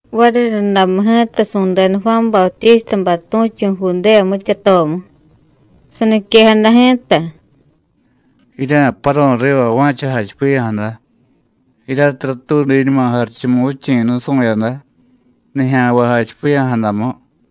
Variryundamu ji̱ta su̱deda Juán Bautístabay tu̱chu̱ Judéya mityatomu. Saniquejada ji̱ta: “Jirya̱paru̱y riva va̱cha jachipiya̱jada, jiryatiy ratuudiñuma Jarichumuvichi̱ nusu̱yada nijya̱nvay jachipiya̱jadamu.”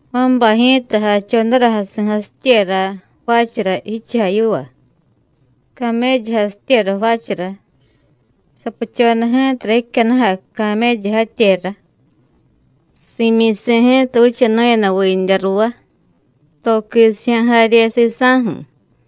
Juánbay ji̱ta jachodara jasi̱jasityera jvaachara jichujay yiva, caméllujasityera jvaachara. Sapuchoda ji̱tara jicyannujay caméllu jatyera. Si̱myisi̱ ji̱ta vichanu̱yada vindya ruvá, to quisijya̱ jarye sisa̱ju̱.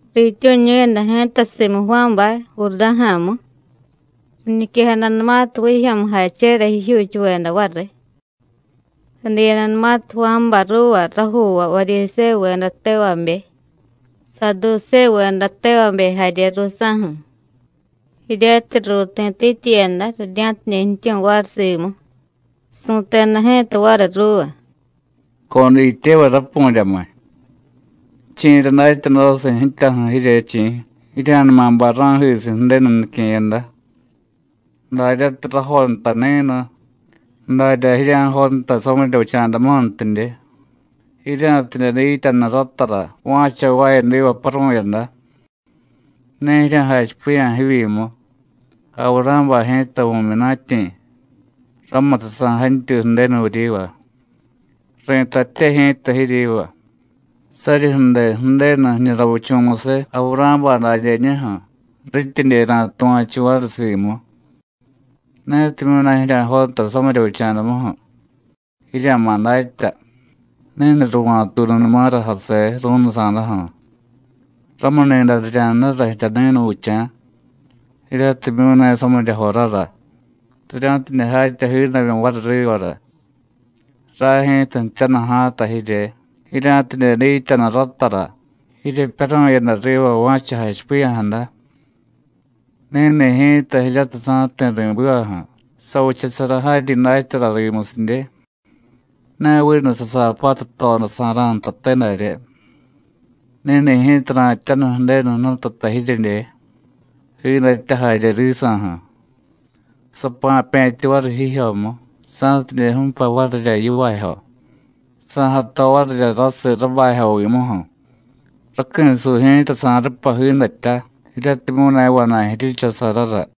Riityu̱ñu̱yada ji̱ta simu Juánbay Jurdá̱ja̱mu riñiquejadanumatiy vijyo̱mujachera jijyuuchuveda variy. Sadiyadanumatiy Juánbay ruuva rajuuvay Varyisévuveda tevabe, Saadusévuveda tevabe jarye ruusa̱ju̱, jiryatiy ruuti̱tityiyada rirya̱tidye jtyu̱y variy simu, su̱teda ji̱ta variy ruuva: “Codityevay rapu̱ryamiy, ¿chi̱ra datyadosiy ji̱tyaju̱ jirye, chi̱? ¡Jirya̱numa bay ra̱jisiy Ju̱denu nique̱yada! Daryatiy rajontay ni̱nu, darya jirya̱jontay samirya vicha̱damuju̱ntidye, jirya̱tidye dityanu ratara va̱cha jvaayadiva paru̱yada. Ne jirya̱jachipiya̱ jivyimu: Avurá̱bay ji̱ta vu̱myunatyi̱, ramutiy sa̱jantyuy Ju̱denu vuryiva. Ri̱tatye ji̱ta jiryiva: Saryi ju̱de Ju̱denu jiñu ravichu̱musiy Avurá̱bay dadyeñuju̱ rityidye ra̱tuva̱chu variy simu. Netimyu̱ ne jirya̱jontay samirya vicha̱damuju̱, jirya̱ma̱ datya: Ni̱nu ruva̱tuununumara jaseé, ru̱nusa̱daju̱. Ramuni̱day rirya̱jnura jirya ni̱nuvicha̱ jiryatimyu̱ ne samirya jorara, rirya̱tidye jatya jiidamyu variy rivara. Ray ji̱ta jtyanu ja̱a̱ta jirye, jirya̱tidye dityanu ratara jiryepyaru̱yada riva va̱cha jachipiya̱jada. Ni̱ni̱ ji̱ta jiryatiy sa̱jti̱ ri̱bivaju̱ savichasara jaryi datyara rimusidye. Ne vinu sasaapatu jtodasa̱ra̱ ntate darye. Ni̱ni̱ ji̱ta ra̱jtyanu Ju̱denu Jnututa jiryedye, jiidatya jarye risa̱ju̱. Sapa̱pe̱tyu variy jijyomu, sa̱tidye ju̱pay varirya yivaajyo, sa̱jato varirya rasiy rabajyovimuju̱, raqui̱suy ji̱ta sa̱rupay jiidatya jiryatimyu̱ ne vana̱y ji̱richasarara.”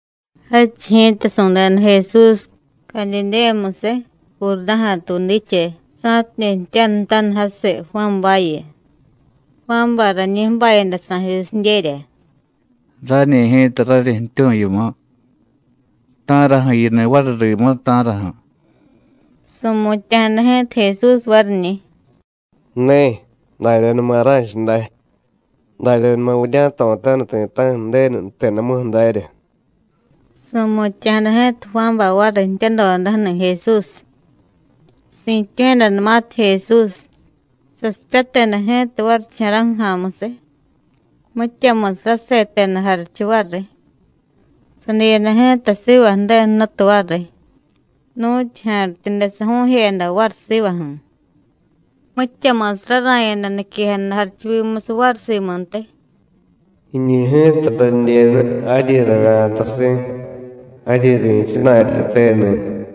Jadchiy ji̱ta su̱deda Jesús Cadidéyamusiy, Jurdá̱ja̱ tuudiche, sa̱tidye jtyanutaniy jasiy Juánbayu. Juánbay rañi ju̱bayada sa̱jisidyerya: “Rañi ji̱ta raryi jtyu̱y yimu. ¿Ta̱raju̱ yiniy variy rimu, ta̱raju̱?” Su̱mutya̱jada ji̱ta Jesús variñi̱: “Ne, daryanuma ra̱cha day, daryanuma vurya̱jto̱taniy ti̱ta̱ju̱ Ju̱denu jtedamuju̱ darya.” Su̱mutya̱jada ji̱ta Juánbay variy jtyadodaju̱ni̱ Jesús. Si̱tyu̱yadanumatiy Jesús, sasipyateda ji̱ta varicha̱ra̱ju̱ ja̱a̱musiy, mityamusiy raseteda jarichu variy, sadiyada ji̱ta siva Ju̱denu Jnutu variy, nu̱tyu ja̱rityude saju̱u̱jeyada variy sivaju̱. Mityamusiy rara̱yada niquejada jarichuvimusiy variy simuntiy: “Jiñu ji̱ta radyenu jaryi ravya̱tasi̱, jaryi ri̱chana̱tyateni̱.”